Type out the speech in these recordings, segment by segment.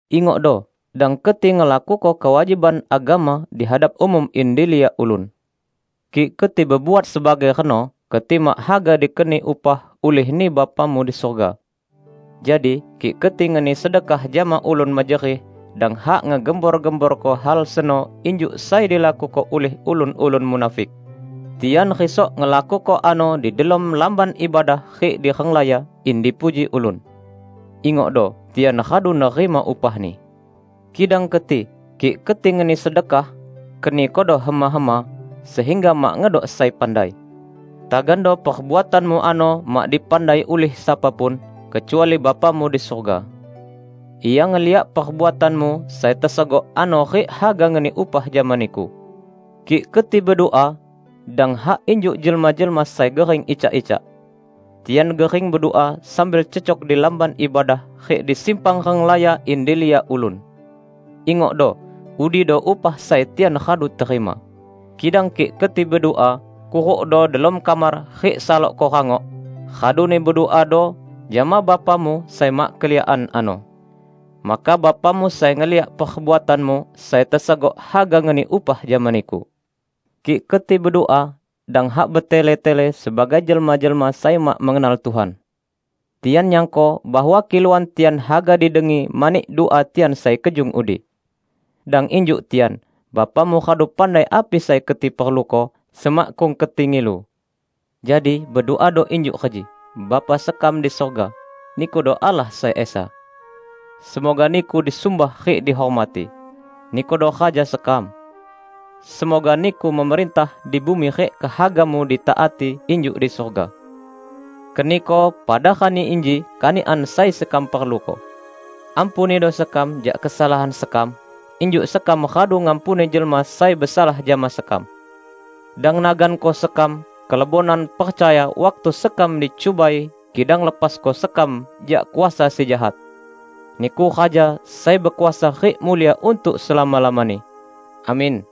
"Ingokdo, dang keti ngelakuko kewajiban agama di hadap umum in diliak ulun. Kik keti bebuat sebagai reno, keti mak haga dikeni upah ulih-Ni Bapamu di surga. Jadi, kik keti ngeni sedekah jama ulun mejerih, dang hak ngegembor-gemborko hal seno injuk sai dilakuko ulih ulun-ulun munafik. Tian risok ngelakuko ano di delom lamban ibadah rik di renglaya, in dipuji ulun. Ingokdo, tian radu nerima upahni. Kidang keti, kik keti ngeni sedekah, kenikodo hema-hema, sehingga mak ngedok sai pandai. Tagando perbuatanmu ano mak dipandai ulih sapa pun, kecuali Bapamu di surga. Ia ngeliak perbuatanmu sai tesegok ano rik haga ngeni upah jama niku." "Kik keti bedua, dang hak injuk jelma-jelma sai gering icak-icak. Tian gering bedua sambil cecok di lamban ibadah rik di simpang renglaya in diliak ulun. Ingokdo, udido upah sai tian radu terima. Kidang kik keti bedua, kurukdo delom kamar rik salokko rangok, raduni beduado jama Bapamu sai mak keliakan ano. Maka Bapamu sai ngeliak perbuatanmu sai tesegok haga ngeni upah jama niku. Kik keti bedua, dang hak betele-tele sebagai jelma-jelma sai mak mengenal Tuhan. Tian nyangko bahwa kiluan tian haga didengi mani dua tian sai kejung udi. Dang injuk tian. Bapamu radu pandai api sai keti perluko, semakkung keti ngilu. Jadi beduado injuk reji, 'Bapa sekam di surga: Nikudo Allah sai Esa. Semoga Niku disumbah rik dihormati. Nikudo Raja sekam. Semoga Niku memerintah di bumi rik kehaga-Mu ditaati injuk di surga. Keniko pada rani inji kanikan sai sekam perluko. Ampunido sekam jak kesalahan sekam, injuk sekam radu ngampuni jelma sai besalah jama sekam. Dang naganko sekam kelebonan percaya waktu sekam dicubai kidang lepasko sekam jak kuasa si Jahat. [Niku Raja sai bekuasa rik mulia untuk selama-lamani. Amin.]'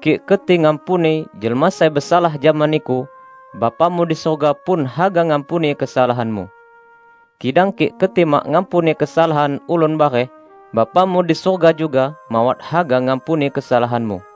Kik keti ngampuni jelma sai besalah jama niku, Bapamu di surga pun haga ngampuni kesalahanmu. Kidang kik keti mak ngampuni kesalahan ulun bareh, Bapamu di surga juga mawat haga ngampuni kesalahanmu."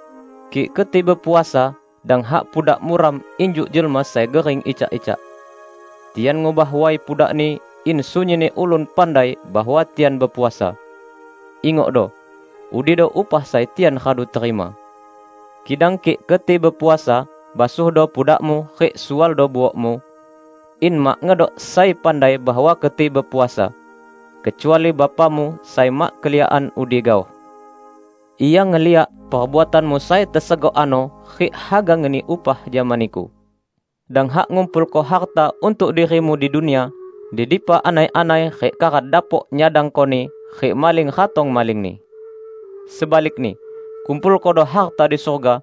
"Kik keti bepuasa, dang hak pudak muram injuk jelma sai gering icak-icak. Tian ngubah way pudakni in sunyinni ulun pandai bahwa tian bepuasa. Ingokdo, udido upah sai tian radu terima. Kidang kik keti bepuasa, basuhdo pudakmu rik sualdo buokmu, in mak ngedok sai pandai bahwa keti bepuasa, kecuali Bapamu sai mak keliakan udi gaoh. Ia ngeliak perbuatanmu sai tesegok ano rik haga ngeni upah jama niku." "Dang hak ngumpulko harta untuk dirimu di dunia, di dipa anai-anai rik karat dapok nyadangkoni rik maling ratong malingni. Sebalikni, kumpulkodo harta di surga,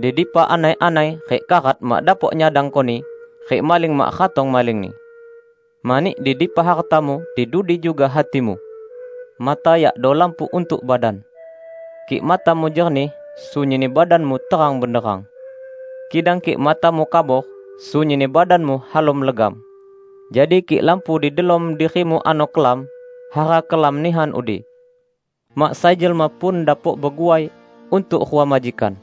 di dipa anai-anai rik karat mak dapok nyadangkoni, rik maling mak ratong malingni. Mani di dipa hartamu, di dudi juga hatimu!" "Mata yakdo lampu untuk badan. Kik matamu jernih, sunyinni badanmu terang benderang. Kidang kik matamu kabor, sunyinni badanmu halom legam. Jadi kik lampu di delom dirimu ano kelam, hara kelam nihan udi!" "Mak sai jelma pun dapok beguai untuk rua majikan.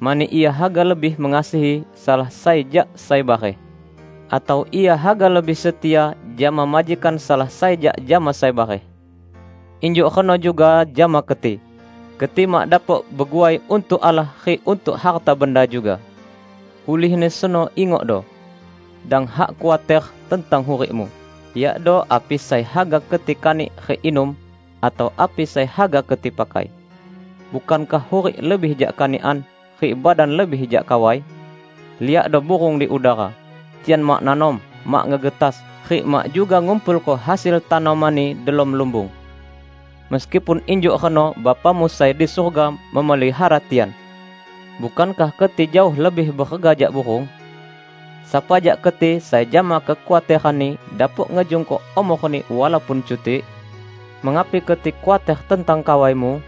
Mani ia haga lebih mengasihi salah sai jak sai bareh. Atau ia haga lebih setia jama majikan salah sai jak jama sai bareh. Injuk reno juga jama keti. Keti mak dapok beguai untuk Allah rik untuk harta benda juga. Ulihni seno ingokdo; dang hak khuater tentang hurikmu, yakdo api sai haga keti kanik rik inum, atau api sai haga keti pakai. Bukankah hurik lebih jak kanikan, rik badan lebih jak kawai? Liakdo burung di udara. Tian mak nanom, mak ngegetas, rik mak juga ngumpulko hasil tanomanni delom lumbung. Meskipun injuk reno Bapamu sai di surga memelihara tian! Bukankah keti jaoh lebih berega jak burung? Sapa jak keti sai jama kekhuateranni dapok ngejungko umorni walaupun cutik? Mengapi keti khuater tentang kawaimu?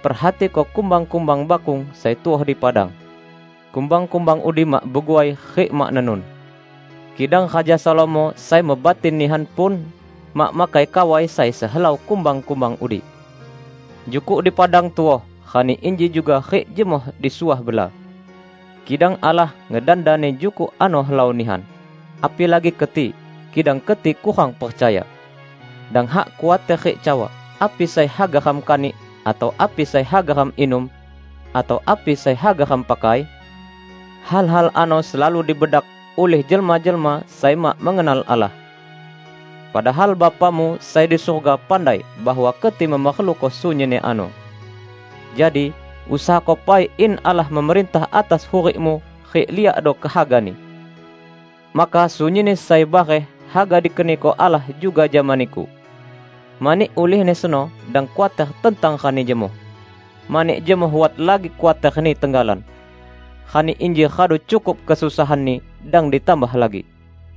Perhatiko kumbang-kumbang bakung sai tuoh di padang. Kumbang-kumbang udi mak beguai rik mak nenun; kidang Raja Salomo sai mebatin nihan pun, mak makai kawai sai sehelau kumbang-kumbang udi! Jukuk di padang tuoh rani inji juga rik jemoh disuah bela. Kidang Allah ngedandani jukuk ano helau nihan. Apilagi keti! Kidang keti kurang percaya! Dang hak khuater rik cawa, 'Api sai haga ram kanik,' atau 'api sai haga ram inum', atau 'api sai haga ram pakai'? Hal-hal ano selalu dibedak ulih jelma-jelma sai mak mengenal Allah. Padahal Bapamu sai di surga pandai bahwa keti memerluko sunyinni ano. Jadi, usahako pai in Allah memerintah atas hurikmu rik liakdo kehaga-Ni. Maka sunyinni sai bareh haga dikeniko Allah juga jama niku. Mani ulihni seno, dang khuater tentang rani jemoh. Mani jemoh wat lagi khuaterni tenggalan. Rani inji radu cukup kesusahanni, dang ditambah lagi."